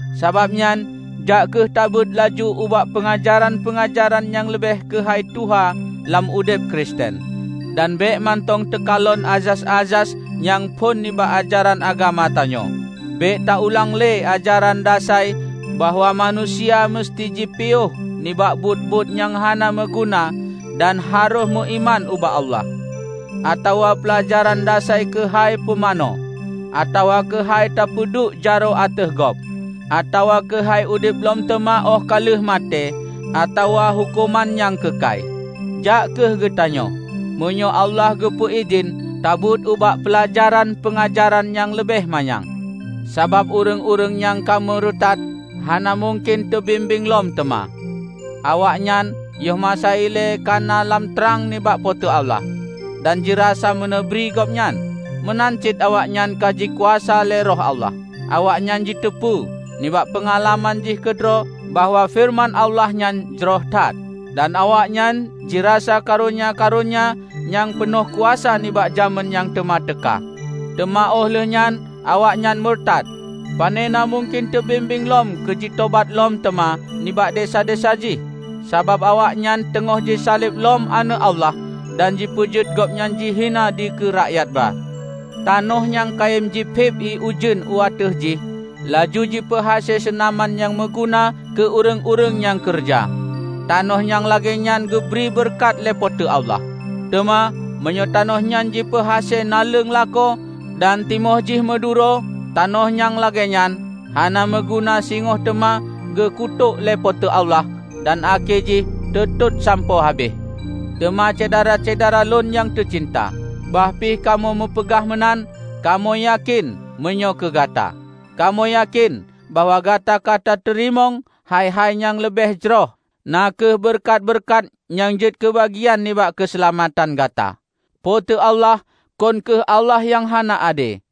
Sabab nyan, jak kheueh tabeuet laju ubak peungajaran-peungajaran nyang leubeh keuhai tuha lam udeb Kristen, dan bék mantong teukalon azas-azas nyang phon nibak ajaran agama tanyoe. Bék ta ulang lé ajaran dasai bahwa manusia meuseuti jipiôh nibak buet-buet nyang hana meuguna dan harôh meuiman ubak Allah, atawa peulajaran dasai keuhai pumanö atawa keuhai teupeuduek jaroe ateueh gob, atawa keuhai udeb lom teuma óh ka lheueh maté atawa huköman nyang keukai. Jak kheueh geutanyoe, meunyoe Allah geupeu idhin, tabeuet ubak peulajaran-peungajaran nyang leubeh mayang! Sabab, ureuëng-ureuëng nyang ka meurutat, hana mungken teubimbéng lom teuma. Awaknyan yoh masa ilée kana lam trang nibak Po teu Allah, dan jirasa meuneubri Gobnyan. Meunan cit awaknyan ka jikuasa lé Roh Allah. Awaknyan jiteupeu nibak peungalaman jih keudroe bahwa feureuman Allah nyan jroh that, dan awaknyan jirasa karonya-karonya nyang peunoh kuasa nibak jamén nyang teuma teuka. Teuma óh lheueh nyan awaknyan meurutat! Panena mungken teubimbéng lom keujitobat lom teuma nibak desya-desya jih. Sabab awaknyan teungoh jisaleb lom Aneuëk Allah dan jipeujeuet Gobnyan jihina dikeue rakyat ba. Tanoh nyang kayém jiphiéb ié ujeuen u ateueh jih, laju jipeuhase seunaman nyang meuguna keu ureuëng-ureuëng nyang keureuja, tanoh nyang lagée nyan geubri beureukat lé Po teu Allah. Teuma meunyoe tanoh nyan jipeuhase naleueng lakoe dan timoh jih meuduro, tanoh nyang lagée nyan hana meuguna singoh teuma geukutôk lé Po teu Allah dan akhé jih teutot sampoe habéh. Teuma Syedara-syedara lôn nyang teucinta, bah pih kamoe meupeugah meunan, kamoe yakén meunyoe keu gata. Kamoe yakén bahwa gata ka tateurimong hai-hai nyang leubeh jroh, na kheueh beureukat-beureukat nyang jeuet keubagian nibak keuseulamatan gata. Po teu Allah kon kheueh Allah nyang hana ade.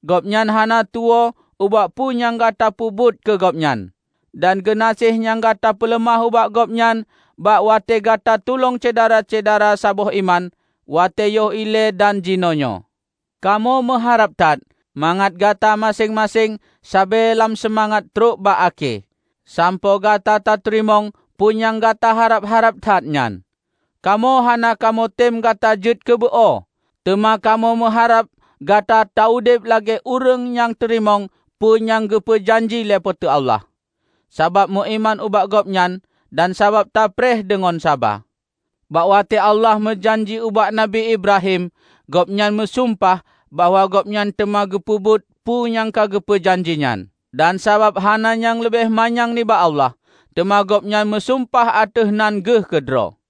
Gobnyan hana tuwoe ubak peue nyang gata peubuet keu Gobnyan, dan geunaséh nyang gata peuleumah ubak Gobnyan bak watée gata tulông syedara-syedara saboh iman, watée yoh ilée dan jinoenyoe. Kamoe meuharab that mangat gata maséng-maséng sabe lam seumangat trok bak akhé, sampoe gata tateurimong peue nyang gata harab-harab that nyan. Kamoe hana kamoe tem gata jeuet keu beu-o. Teuma kamoe meuharab gata taudeb lagée ureuëng nyang teurimong peue nyang geupeu janji lé Po teu Allah, sabab meuiman ubak Gobnyan dan sabab tapreh deungon saba. Bak watée Allah meujanji ubak Nabi Ibrahim, Gobnyan meusumpah bahwa Gobnyan teuma geupeubuet peue nyang ka geupeu janji nyan. Dan sabab hana nyang leubeh manyang nibak Allah, teuma Gobnyan meusumpah ateueh nan Geuh keudroe.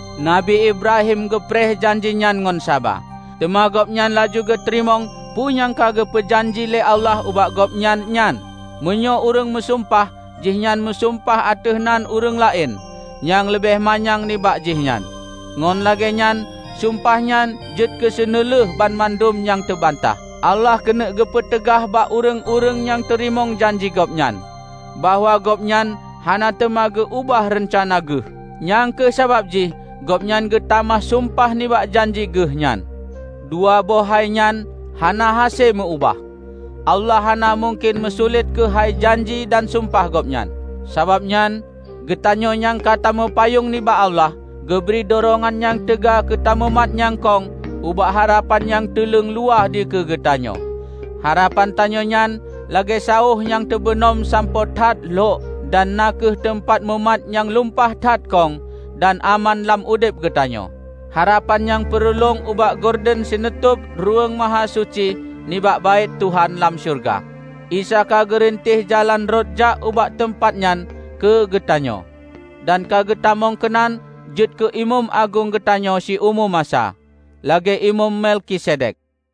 Nabi Ibrahim geupreh janji nyan ngon saba, teuma gobnyan laju geuteurimong peue nyang ka geupeu janji lé Allah ubak gobnyan nyan. Meunyoe ureuëng meusumpah, jihnyan meusumpah ateueh nan ureuëng laén nyang leubeh manyang nibak jihnyan, ngon lagée nyan sumpah nyan jeuet keuseuneulheueh banmandum nyang teubantah. Allah keuneuk geupeuteugaih bak ureuëng-ureuëng nyang teurimong janji Gobnyan, bahwa Gobnyan hana teuma geu ubah reuncana Geuh. Nyang kheueh sabab jih Gobnyan geutamah sumpah nibak janji Geuh nyan. Dua boh hai nyan hana hase meu ubah: Allah hana mungken meusulet keuhai janji dan sumpah Gobnyan. Sabab nyan, geutanyoe nyang ka tameupayong nibak Allah, geubri durongan nyang teuga keutamumat nyang kong ubak harapan nyang teuleung luwah dikeue geutanyoe. Harapan tanyoe nyan lagée saoh nyang teubeunom sampoe that lhok dan na kheueh teumpat tamumat nyang lumpah that kong dan aman lam udeb geutanyoe. Harapan nyang peureulong ubak gorden sinutôb Ruweueng Mahasuci nibak Baét Tuhan lam syeuruga. Isa ka geurinteh jalan rot jak ubak teumpat nyan keu geutanyoe, dan ka geutamong keunan jeuet keu Imeum Agong geutanyoe siumu masa, lagée Imeum Melkisedek.